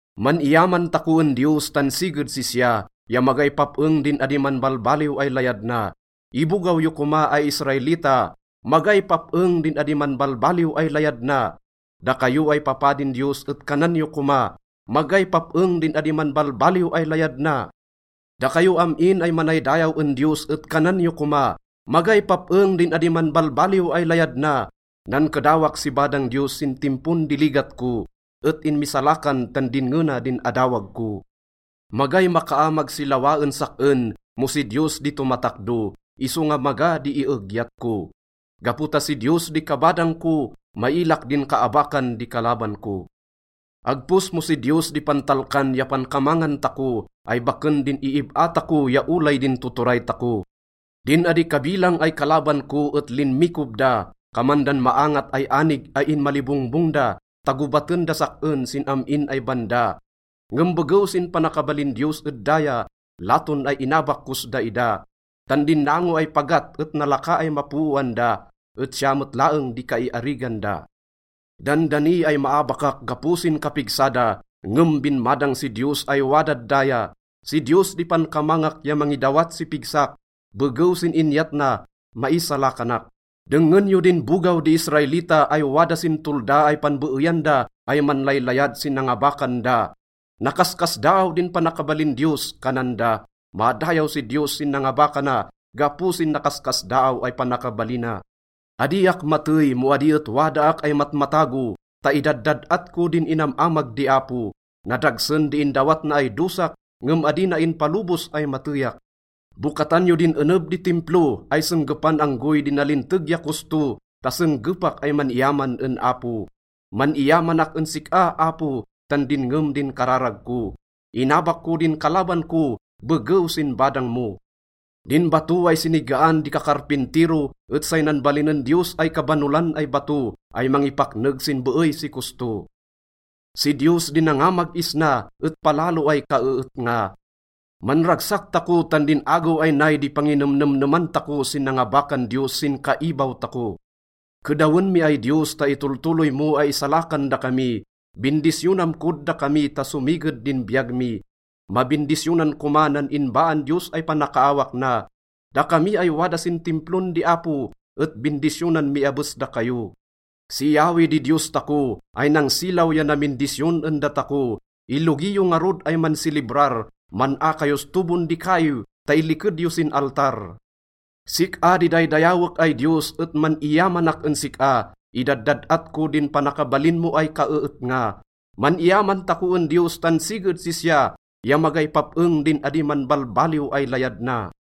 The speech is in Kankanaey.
Man-iyaman tako en Diyos tan siged sisya, ya magay pap-eng din adi manbalbaliw ay layad na. Ibogaw yo koma ay Israelita, “Magay pap-eng din adi manbalbaliw ay layad na!” Dakayo ay papadin Diyos et kanan yo koma, “Magay pap-eng din adi manbalbaliw ay layad na!” Dakayo am-in ay manaydayaw en Diyos et kanan yo koma, “Magay pap-eng din adi manbalbaliw ay layad na!” Nankedawak si badang Diyos sin timpon di ligat ko et inmisalakan tan dinnge na din adawag ko. Magay makaamag si lawa en sak-en mo si Diyos di tomatakdo, isonga maga di iegyat ko. Gapo ta si Diyos di kabadang ko, mailak din kaabakan di kalaban ko. Agpos mo si Diyos di pantalkan ya pankamangan tako ay baken din iib-a tako ya olay din tuturay tako. Din adi kabilang ay kalaban ko et linmikob da, kaman dan maangat ay anig ay inmalibongbong da, ta gobaten das sak-en sin am-in ay banda. Ngem begew sin panakabalin Diyos ed daya, laton ay inabak kos daida, tan din nango ay pagat et nalaka ay mapooan da, et siya met laeng di kaiarigan da. Dandani ay maabakak gapo sin kapigsa da, ngem binmadang si Diyos ay wadad daya. Si Diyos di pankamangak ya mangidawat si pigsak, begew sin inyat na, maisalakanak. Dengngen yo din bogaw di Israelita ay wada sin tolda ay panbeeyan da ay manlaylayad sin nangabakan da. “Nakaskasdaaw din panakabalin Diyos,” kanan da. “Madayaw si Diyos sin nangabakana gapo sin nakaskasdaaw ay panakabalina.” Adiak matey mo adi et wadaak ay matmatago ta idaddad-at ko din inam-amag di Apo. Nadagsen di indawat na ay dosak, ngem adi na inpalobos ay mateyak. Bokatan yo din eneb di Timplo ay senggepan anggoy di nalinteg ya kosto ta senggepak ay man-iyaman en Apo. Man-iyamanak en sik-a, Apo, tan dinngem din kararag ko. Inabak ko din kalaban ko begew sin badang mo. Din bato ay sinigaan di kakarpintiro et say nanbalinen Diyos ay kabanolan ay bato ay mangipakneg sin beey si kosto. Si Diyos di nangamag isna, et palalo ay kaeetnga. Manragsak tako tan din agew ay nay di panginemnemneman tako sin nangabakan Diyos sin kaibaw tako. Kedawen mi ay Diyos ta itoltoloy mo ay isalakan dakami, bindisyonam kod dakami ta somiged din biyag mi. Mabindisyonan koma nan inbaan Diyos ay panakaawak na. Dakami ay wada sin Timplon di Apo et bindisyonan mi abes dakayo. Si Yahweh di Diyos tako ay nangsilaw ya namindisyon en datako. Ilogi yo ngarud ay mansilibrar, man-a kayos tobon di kaiw ta iliked yo sin altar. Sik-a di daydayawek ay Diyos et man-iyamanak en sik-a, idaddad-at ko din panakabalin mo ay kaeetnga. Man-iyaman tako en Diyos tan siged sisya, ya magay pap-eng din adi manbalbaliw ay layad na.